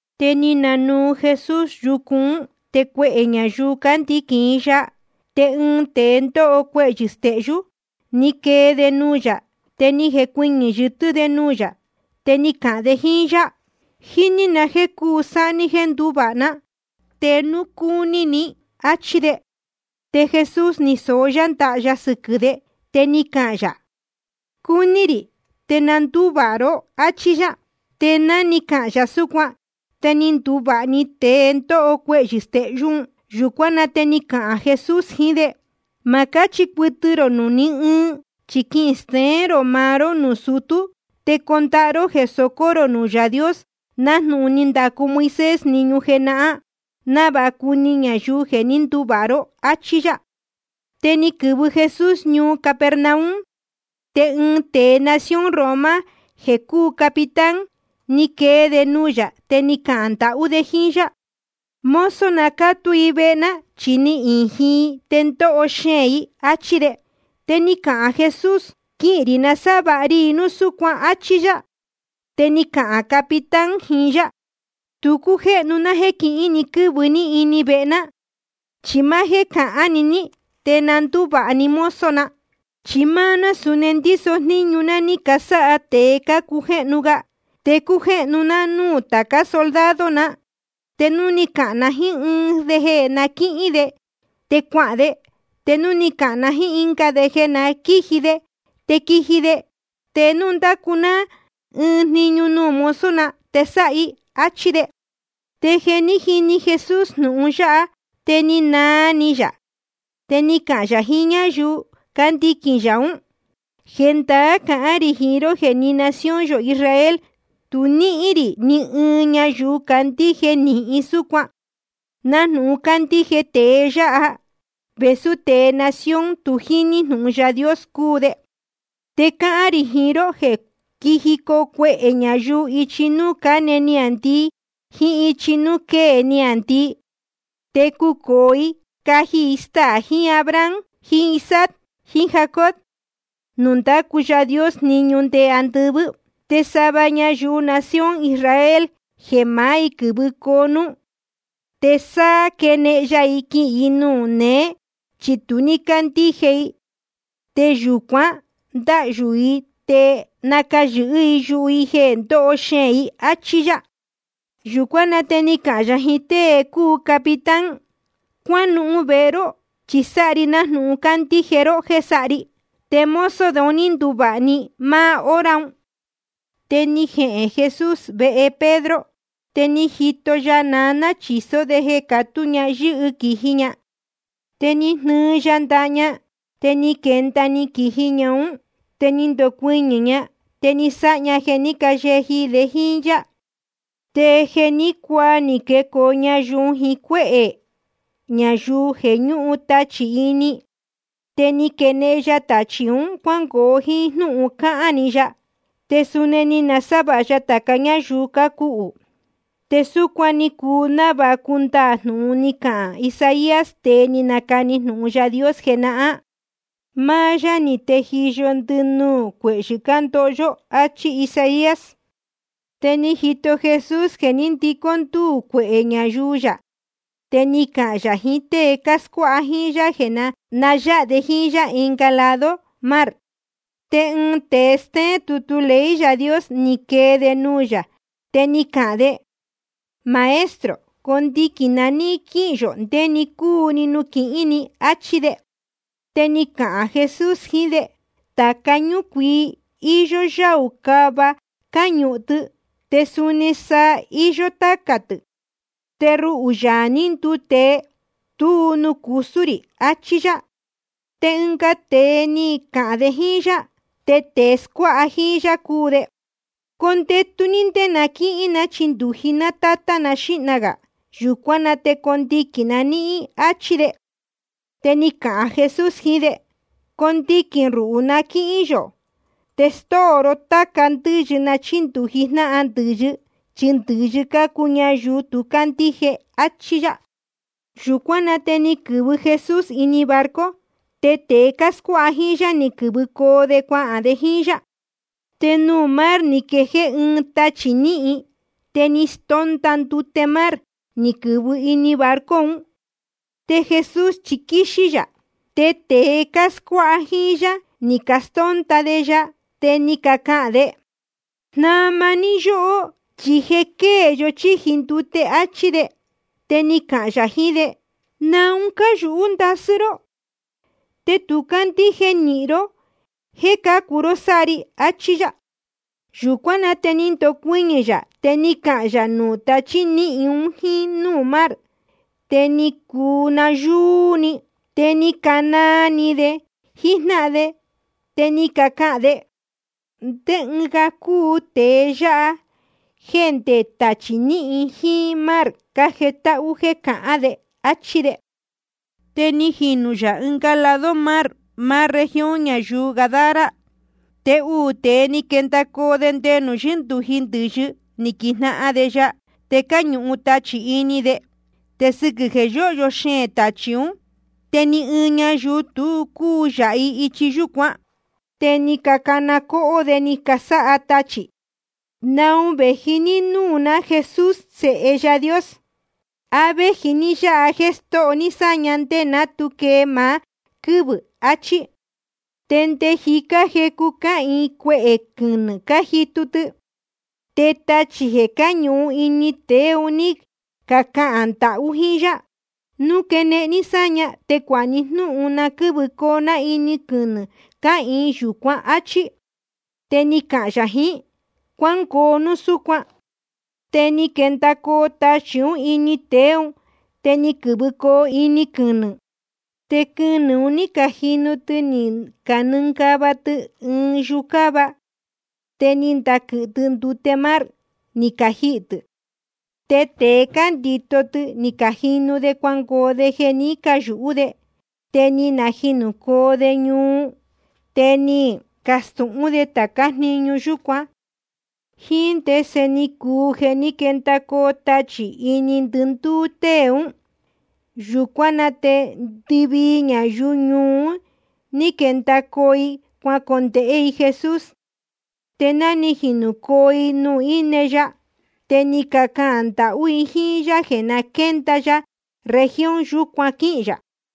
Te ni nanuu Jesús yucu ún, te cuehē ñayuu cándiquīn i ya. Te ɨɨn tēe ndóho cuehyɨ̄ stehyú, ni quee de nuū yā. Te ni jecuɨñɨ̄ yɨtɨ́ de nuū yā, te ni cahān de jíín yá: Jíní na jéē cuu sáha ní jéē nduvāha ná, te núu cúní ni, áchí de. Te Jesús ni soó yá ndaha ya sɨquɨ̄ de, te ni cahān yā: Cúní rī. Te na ndúvāha ró, áchí yá. Te ná ni cahān yā súcuan, te ni nduvāha‑ni tēe ndóho cuehyɨ̄ stehyú un. Yūcuán na te ni cahān Jesús jiín de: Ma cáchi cuɨtɨ rō nuū ní ɨɨn. Chi quisteén rō maá ró nuū sutú, te condahá ró jeē socó rō nuū Yaā Dios, nájnūhun ni ndacu Moisés jniñu jenahán, návāha cuni ñayuu jeē ní nduvāha ró. Achí yá. Te ni quɨ̄vɨ Jesús ñuu Capernaum. Te ɨɨn tēe nación Roma jeē cúu capitán, ni quee de nuū yā, te ni cahān ndahú de jíín yá: Mozo na cátú i vehe ná, chi ni ījin i te ndóho xeēn i, áchí de. Te ni cahān Jesús: Quihīn rī nasávāha ri i núu súcuan, áchí yá. Te ni cahān capitán jiín yá: Tu cújéhnu ná jéē quihín ni quɨ́vɨ ní vehe ná. Chi máá jéē cahán‑ni ní, te na ndúvāha‑ni mozo na. Chi máá ná suni ndíso jníñu ná ní casáha tēe cácujéhnu ga. Te cújéhnu ná núū tācá soldado na. Te núu cáhán na jíín ɨɨn de jeē na quíhín de, te cuahān de. Te núu cáhán na jíín ɨnga de jeē na quíji de, te quíji de. Te núu ndácu ná ɨɨn jniñu nuū mozo na, te sáha i. Achí de. Te jeē ní jini Jesús jnūhun yáha, te ni naa ni yā. Te ni cahān yā jiín ñáyuu cándiquīn yā ún: Jendaá cahán rī jiín ró jeē ni nación yō Israel tu ní níhín rī ni ɨɨn ñayuu candíje nīhin súcuan, nájnūhun cándíje tēe yáha, vēsú tēe nación tu jíní jnūhun Yaā Dios cúu de. Te cáhán rī jiín ró jeē quíjicoo cuehē ñayuu ichi núū cáne niāndii jíín ichi núū quée niāndii. Te cucōo i caji i staā jiín Abraham jiín Isaac jiín Jacob nuū ndácu Yaā Dios jniñu nde andɨvɨ́. Te sava ñayuu nación Israel jeē maá i quɨ̄vɨcoo núú, te sa quenehen ya i quihīn i nuū néē, chi tu ní cácandíje i. Te yūcuan ndáhyū i te nacayɨ̄hɨ́ yuhu i jeē ndoho xeēn i. Achí yá. Yūcuán na te ni cahān yā jiín tée cúu capitán: Cuánuhun vehe ró, chi sáha ri nájnūhun cándíje ró jéē sáha ri. Te mozo de un ní nduvāha‑ni i máá hora un. Te ni jehēn Jesús vehe Pedro. Te ni jito ya naná chīsó de jeē catú ña yɨ́hɨ quīji ña. Te ni jnɨɨ ya ndaha ña, te ni quenda‑ni quīji ún ña. Te ni ndocuɨñɨ̄ ña, te ni sáha ña jeē ní cayeji de jíín yá. Te jeē ní cuaa ni quecoo ñayuu jiín cuéhē ñayuu jeē ñúhun tachī ini i. Te ni quenehen ya tachī un cuángoo jíín jnúhun cáhán‑ni ya. Te suni ni nasávāha ya tāca ñáyuu cácuhū. Te súcuan ni cuu návāha cundaā jnūhun ni cahān Isaías, tēe ni nacani jnūhun Yaā Dios jenahán: Máá yá ni tejiyo ndɨnuū cuehyɨ̄ cándoho yó, áchí Isaías. Te ni jito Jesús jeē ní ndicó ndúū cuehē ñayuu yā. Te ni cahān yā jiín tée cáscuáha jíín yá jeē na yáha de jíín yá ɨnga lado mar. Te ɨɨn tēe stéén tutu ley Yaā Dios, ni quee de nuū yā, te ni cahān de: Maestro, condiquīn na níhín quíhīn yō ndé‑ni cúu‑ni nuū quihín ni, áchí de. Te ni cahān Jesús jiín de: Tāca ñúcuii, íyó yáū cava cáñuhun tɨ. Te suni saa, iyó tácā tɨ̄. Te ruhū, Yaā ní nduu tēe, tuú nuū cusú rī, achí yá. Te ɨnga tēe ni cahān de jíín yá, te tēe scuáha jíín yá cúu de: Condetu ní ndé na quíchindūji ná tátá na xíhna gā. Yūcuán na te condiquīn na níhín, áchí de. Te ni cahān Jesús jiín de: Condiquīn ruhū na quíhín yō. Te stóo tāca ndɨ́yɨ na chíndūji jnáhan ndɨ̄yɨ, chi ndɨ̄yɨ cácuu ñayuu tu cácandíje. Achí yá. Yūcuán na te ni quɨ̄vɨ Jesús ini barco, te tēe cáscuáha jíín yá ni quɨ̄vɨcoo de cuahān de jíín yá. Te nuū mar ni jequɨ̄hɨ ɨɨn tachī níhin, te ni stónda ndute mar, ni quɨ̄vɨ ini barco un. Te Jesús chi quíxí yā. Te tēe cáscuáha jíín yá ni castónda de ya, te ni cacahān de: Jnama ní yóhó, chi je quée yó chíji ndute, áchí de. Te ni cahān yā jiín de: ¿Naun cáyūhú ndasɨ́ ró? Te tu cácandíje nīhin ró jéē cácu ró sáha ri, achí yá. Yūcuán na te ni ndocuɨñɨ̄ yā, te ni cahān yā nuū tachí níhin un jíín núū mar. Te ni cuu nayúú íī‑ni. Te ni canaa ni de jíjnáhan de, te ni cacahān de: ¿Ndé ɨɨn ga cúu tēe yáha, jéē ndé tachī níhin jíín mar cájetáhú jéē cahán de? áchí de. Te ni jinū yā ɨnga lado mar, máá región ñayuu Gadara. Te uū tēe ni quendacoo de nde nuū yíndūji ndɨ̄yɨ, ni quijnahan de ya. Te cáñuhun tachī ini de, te sɨquɨ̄ jeē yóhyo xeēn tachī ún, te ni ɨɨn ñayuu tu cúu yāha i ichi yúcuan. Te ni cacana cóhó de ni casáha tachī: ¿Naun vēji ní núū ná, Jesús Sēhe Yaā Dios? ¿A véji ní yáha jeē stóho ní sáña ndé ná tu quee maá quɨ́vɨ̄? áchí. Te nde jicá jecu cáhīin cuehē quɨnɨ̄ cájitu tɨ. Te tachī jeē cáñuhun ini tēe un ní cacahān ndahú jíín yá: Núu quenehen ní sáña, te cuāha ni jnúhun na quɨ́vɨcoo ná ini quɨnɨ̄ cáhīin yūcuán, áchí. Te ni cahān yā jiín: Cuángoo núu súcuan. Te ni quendacoo tachī ún ini tēe ún, te ni quɨ̄vɨcoo ini quɨnɨ̄. Te quɨnɨ̄ un ní cajinu tɨ ni canɨngava tɨ ɨɨn yucáva, te ni ndaquɨ̄hɨ tɨ ndute mar, ni cajihī tɨ̄. Te tēe cándito tɨ ni cajinu de cuangoo de jeē ní cayūhú de. Te ni najinūcoo de ñuu. Te ni cacastūhún de tācá jniñu yúcuan, jíín ndese ni cuu jeē ní quendacoo tachī ini ndɨndúú tée ún. Yūcuán na te ndɨvii ñayuu ñuu un, ní quendacoo i cuacondēhé i Jesús. Te ná ni jinūcoo i nuū íne ya, te ni cacahān ndahú i jíín yá jeē na quénda ya región yúcuan quíhīn yā.